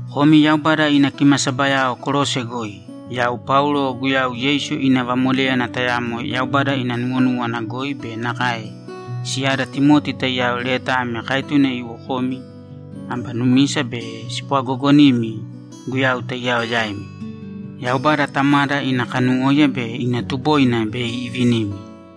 Komi Yaubada ina kimasabayao Kolose goi, Yau Paulo Guyau Yeisu ina vamoléyana tayamo Yaubada ina nuwonúwana goi be nakae siyada Timoti taiyao leta ame kaetune iwo komi aba numisa be spwagoogonimi Guyau taiyao yaimi. Yaubada Tamada ina kanuwóiya be ina tuboina bei ivinimi.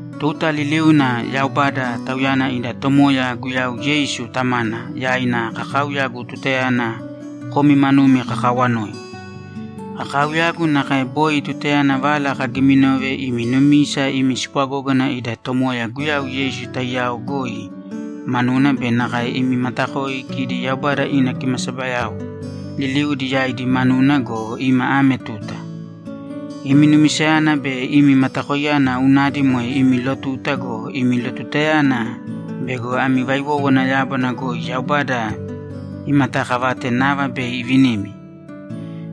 Tuta liliuna Yaubada, Tauyana ida Tomoya Guyau Yeisu Tamana, yaina kakaauyagu tutayana komi manumi kakaawanoi. Kakaauyagu nakae boi tutayana vala kagiminove imi numisa imi spwagógana ida Tomoya Guyau Yeisu taiyao goi manuna be nakae imi matakoi kidi Yaubada ina kimasabayao liliudi yaidi manuna go, ima ame tuta. Imi numisayana be imi matakoiyana unadi moe imi lotuta go, imi lotutayana bego ami vaiwówana yábana goi Yaubada imataakavate nava bei ivinimi.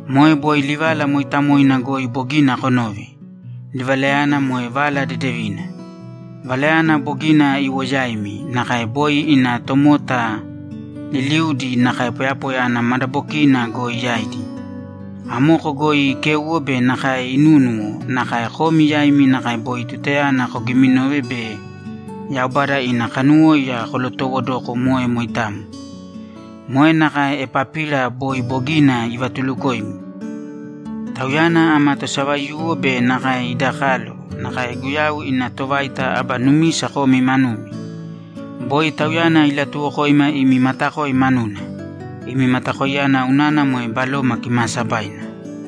Moe boi livala mooitamoina goi bogina konove; livalayana moe Vala Dedevina. Valayana bogina iwo yaimi, nakae boi ina tomota liliuudi nakae poyapoya ana madabokiina goi yaidi. Amoko goi ikéuwo be nakae inúnuwo, nakae komi yaimi nakae boi tutayana kogiminove be Yaubada ina kanuwóiya kolotowodoko moe moitamo. Moe nakae Epapira boi bogina ivatulukoimi. Tauyana ama tosavaiyuwo be nakae ida kalo, nakae Guyau ina tovaita aba numisa komi manumi. Boi tauyana ilatuwokoima imi matakoi manuna. Imi matakoiyana unana moe Baloma Kimaasabaina.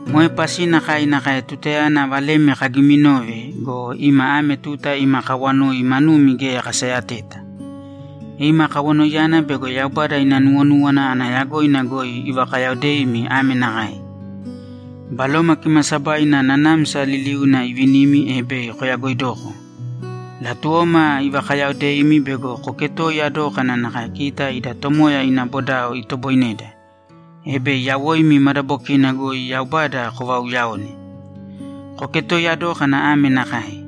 Moe pasina kai nakae tutayana valemi kagiminove go, ima ame tuta ima kawanoi manumi geya kasayateta. Ima kawanoiyana bego Yaubada ina nuwonúwana ana yagoina goi ivakayaodeimi ame nakae: Baloma Kimaasabaina nanamsa liliuna ivinimi, e bei koyagoidoko. Latuwoma ivakayaodeimi bego koketoiya dókana nakae kita ida Tomoya ina bodao itoboineda, e bei yawoimi madabokina goi Yaubada kovauuyaone. Koketoiya dōkana ame nakae: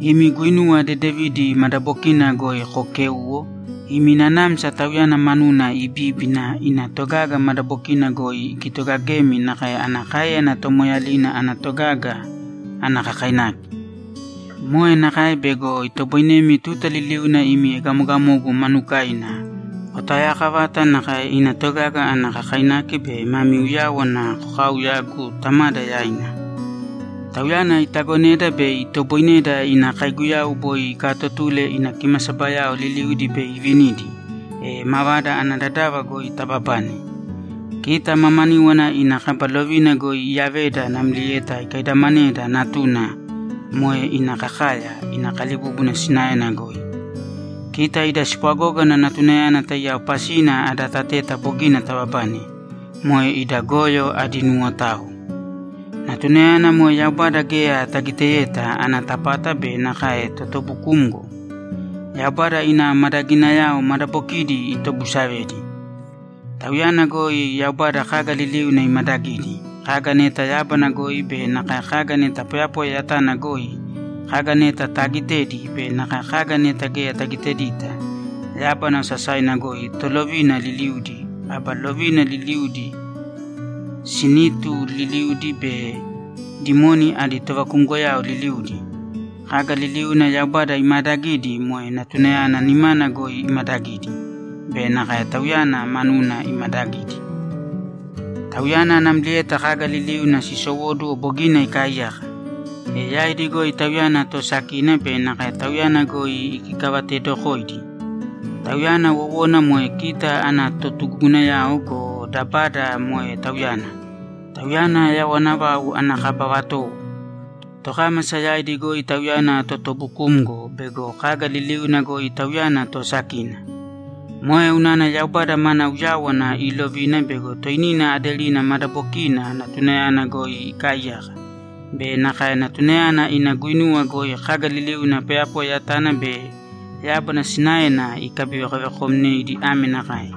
Imi guinuwa dedevidi madabokina goi kookēuwo, imi nanamsa Tauyana manuna ibíbina, ina togaga madabokina goi ikitogagemi nakae ana káeyana tomoeeyalina ana togaga ana kakainaki. Moe nakae bego itoboinemi tuta liliuna imi egamogamogu manukaina, kotaoyaakavata nakae ina togaga ana kakainaki be mami uyáwana kokaauyagu Tamada yaina. Tauyana itagoneda bei itoboineda ina kaiguyau boi ikaatotule ina kimasabayao liliudi bei ivinidi, e mavada ana dadava goi tababane. Kita mamaníwana ina kaba lovina goi iyaveda namlieta ikaidamaneda Natuna, moe ina kakaya, ina kalibúbuna sinaena goi. Kita ida spwagógana Natunayana taiyao pasina ada tateta bogina tababane, moe ida goyo adi nuwotao. Natunayana moe Yaubada geya tagiteyeta ana tapata be nakae totubukumgo. Yaubada ina madaginayao madabokidi itobusavedi. Tauyana goi Yaubada kaga liliuna imadagidi; kaga neta yábana goi be nakae kaga neta poyapoya yatana goi, kaga neta taagitedi be nakae kaga neta geya tagitedita: Yábana osasaina goi tolovina liliudi, aba lovina liliudi, sinitu liliudi be dimoni adi tovakumgoyao liliudi. Kaga liliuna Yaubada imaadagidi moe Natunayana nimana goi imadagidi be nakae Tauyana manuna imadagidi. Tauyana namlieta kaga liliuna sisowóduwo, bogina ikaaiyaka, e yaidi goi Tauyana toosakina be nakae Tauyana goi ikikavateedokoidi. Tauyana wowona moe kita ana totugugunayao go, dabada moe Tauyana. Tauyana yawana vau ana kaba vatowo; tokámasa yaidi goi Tauyana totubukumgo bego kaga liliuna goi Tauyana toosakina. Moe unana Yaubada mana uyáwana iilovina bego toinina aderina madabokiina Natunayana goi ikaaiyaka be nakae Natunayana ina guinuwa goi kaga liliuna poyapoya yatana be yábana sinaena ikabivekovekomneidi ame nakae: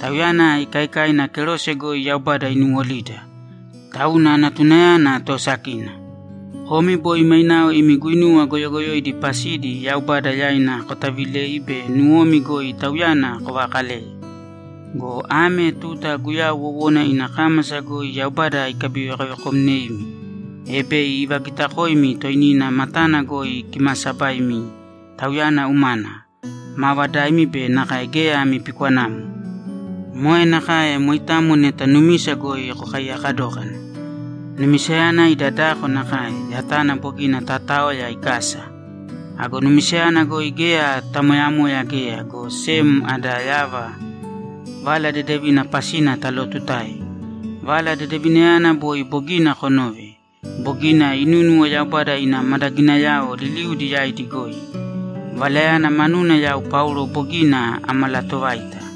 Tauyana ikaikaina kerose goi Yaubada inuwolida. Tauna Natunayana toosakina. Komi boi mainao imi guinuwa goyogoyoidi pasidi Yaubada yaina kotavilei be nuwomi goi Tauyana kovakaleye. Go ame tuta Guyau wowona ina kámasa goi Yaubada ikabivekovekomneimi, e bei ivagitakoimi toinina matana goi kimaasabaimi Tauyana umana, maavadaimi be nakae geya ami pikwanamo. Moe nakae moitamo neta numisa goi kokaiyaka dókana. Numisayana ida dako nakae, yatana bogina tataoya ikasa. Ago numisayana goi geya tamoyamoya geya, go sem ada yava Vala Dedevina pasina talootutae. Vala Dedevinayana boi bogina konove, bogina inúnuwo Yaubada ina madaginayao liliudi yaidi goi. Valayana manuna yau Paulo bogina amalatovaita.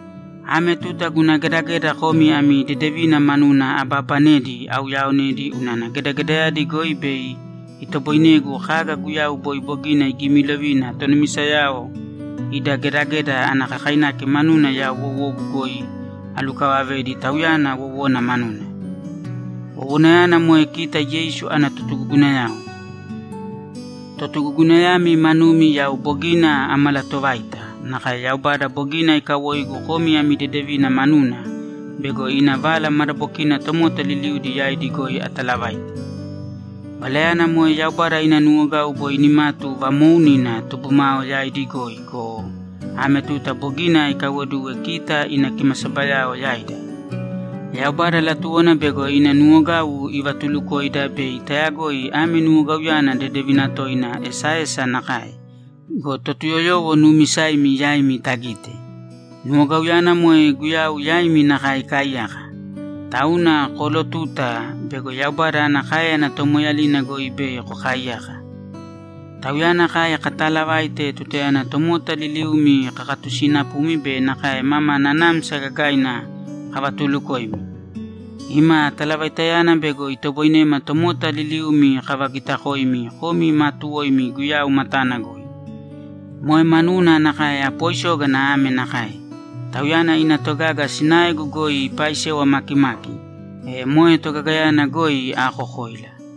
Ame tuta guna gedageda komi ami dedevina manuna abaabanedi auyaaonedi unana gedagedayadi goi bei itoboinegu kaga Guyau boi bogina igimilovina tonumisayao ida gedageda ana kakainaki manuna yau wowogu goi alukavavedi Tauyana wowona manuna. Wowonayana moe kita Yeisu ana totugugunayao. Totugugunayami manumi yau bogina amalatovaita, nakae Yaubada bogina ikawoigu komi ami dedevina manuna bego ina Vala madabokina tomota liliudi yaidi goi atalavaite. Valayana moe Yaubada ina nuwogau boi nimatu vamoounina tubumao yaidi goi go, ame tuta bogina ikaiwoduwe kita ina kimasabayao yaida. Yaubada latuwona bego ina nuwogau ivatulukoida bei tayagoi ame nuwogauyana dedevina toina esaesa nakae go, Totuyoyowo nuumisaimi yaimi tagite. Nuwogauyana moe Guyau yaimi nakae ikaaiyaka. Tauna koolotuta bego Yaubada ana káeyana tomoeeyalina goi bei kokaaiyaka. Tauyana kai kataalavaite tutayana tomota liliumi kakatusinapumi be nakae mama nanamsa gagaina kavatulukoimi. Ima talavaitayana bego itoboinema tomota liliumi kavagitakoimi komi maatuwoimi Guyau matana goi. Moe manuna nakae apoisógana ame nakae: Tauyana ina togaga sinaegu goi ipaisewa makimaki, e moe togagayana goi aakokoila.